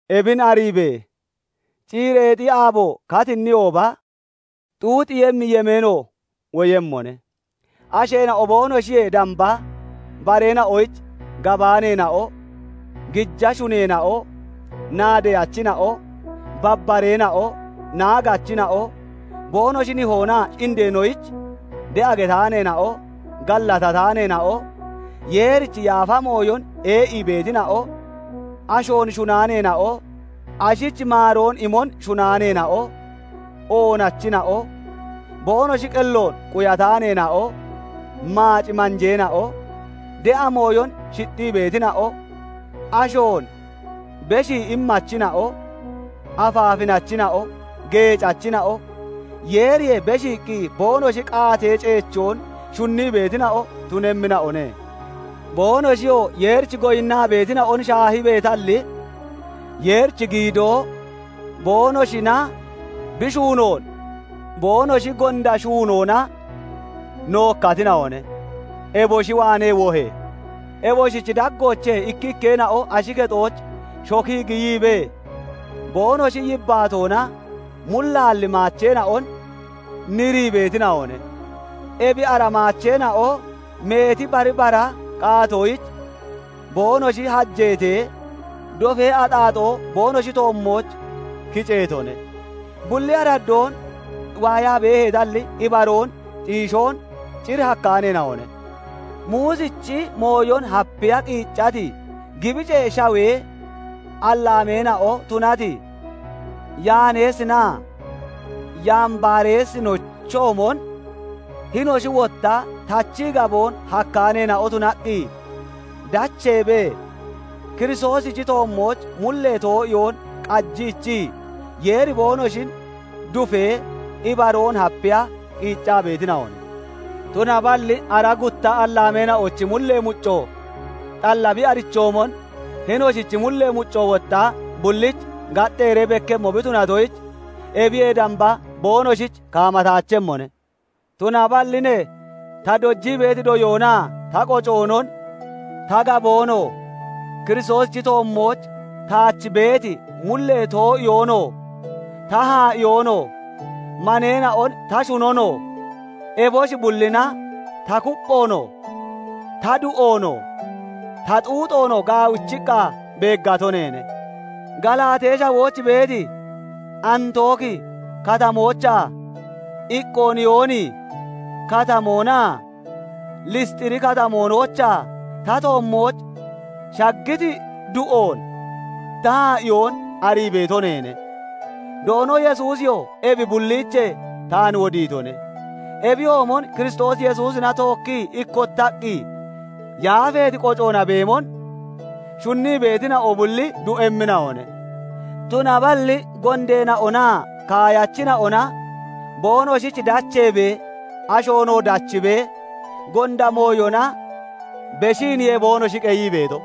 Ebin ariibe! Ciireexi aabo katiniyooba, xuuxiiyemmi yemeeno woyemmone. Asheena'o boonoshiyee damba bareena'oyich gabaaneena'o, gija shuneena'o, naadeyachina'o, babbareena'o, naagachina'o, boonoshi nihoonaa indeenoyich de'a getaaneena'o, gallatataaneena'o, Yeerichi yaafa mooyon ee'ii beetina'o, ashoon shunaaneena'o, ashich maaroon imon shunaaneena'o, oonachina'o, boonoshi qelloon quyataaneena'o, maac manjeena'o, de'a mooyon shixxii beetina'o, ashoon beshii immachina'o, afaafinachina'o, geecachina'o, Yeeriyee beshiiqqi boonoshi qaatee ceechoon shunnii beetina'o tunemmina'one. Boonoshiyoo Yeerich goyinnaa beetina'on shaahibeetalli, Yeerichi giidoo boonoshina bi shuunoon boonoshi gonda shuunoona nookkatina'one; eboshi waanee wohe! Eboshichi daggoochee ikkikkeena'o ashi kexooch shokii giyiibee, boonoshi yibbaatoona mullaalli maacheena'on nirii beetina'one; ebi ara maacheena'o meeti bari bara qaatoyich boonoshi hajeetee, dofee axaaxoo boonoshi toommooch kiceetone. Bulli araddoon waayaa beeheetalli, ibaroon xiishoon cir hakkaaneena'one; Muusichi mooyon hapiya qiiccati, Gibicee Shawee allaameena'o tunati Yaaneesinaa Yambareesinochoomon, hinoshi wotta tachii gaboon hakkaaneena'o tunaqqi dacheebee, Kiristoosichi toommooch mullee too'iyoon qajiichii, Yeeri boonoshin dufee, ibaroon hapiya qiiccaa beetina'one. Tunaballi ara gutta allaameena'ochi mullee mucco xalla bi arichoomon hinoshichi mullee mucco wotta bullich gaxxeeree bekkemmo bi tunatoyich, ebiyee damba boonoshich kaamataachemmone. Tunaballi ne ta dojii beeti doyoonaa ta qocoonon, ta gaboonoo, Kiristoosichi toommooch taach beeti mullee too'iyoonoo, ta haa'iyoonoo, maneena'on ta shunonoo, eboshi bullina ta kupphoonoo, ta du'oonoo, ta xuuxoonoo gaawichiqqa beeggato neene. Galaatee Shawooch beeti Antooki Katamoochaa, Iqooniyooni Katamoonaa Lisxiri Katamoonoochaa ta toommooch shaggiti du'oon ta haa'iyoon arii beeto neene; Doono Yesuusiyoo ebi bulliichee taan wodiitone. Ebiyoomon Kiristoos Yesuusina tookkii ikkottaqqi yaafeeti qocoona beemon shunnii beetina'o bulli du'emmina'one. Tunaballi gondeena'onaa kaayachina'ona boonoshich dacheebee, ashoonoo dachiibee, gonda mooyona beshiiniye boonoshi qeyii beeto.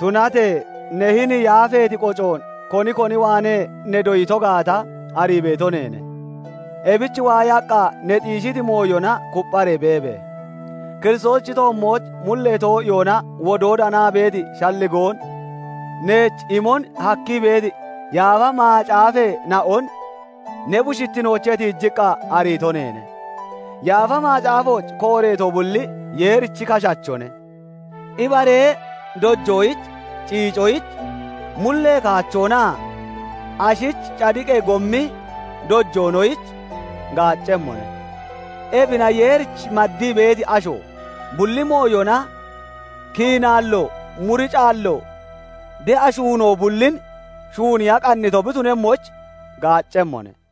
Tunatee ne hini yaafeeti qocoon koni koni waanee ne doyito gaata arii beeto neene; ebich waayaqqa ne xiishiti mooyona kuppharee beebe! Kiristoosichi toommooch mullee too'iyoona wodoo danaa beeti shalligoon neech imon hakkii beeti Yaafa Macaafeena'on ne bushittinoochee tiijiqqa ariito neene. Yaafa Macaafooch kooreeto bulli Yeerichi kashachone; ibaree dojoyich, ciicoyich, mullee kaachoonaa ashich cadiqee gommi dojoonoyich gaaccemmone; ebina Yeerich maddii beeti asho, bulli mooyona kiinaallo muricaallo, de'a shuunoo bullin shuuniya qannito bi tunemmoyich gaaccemmone.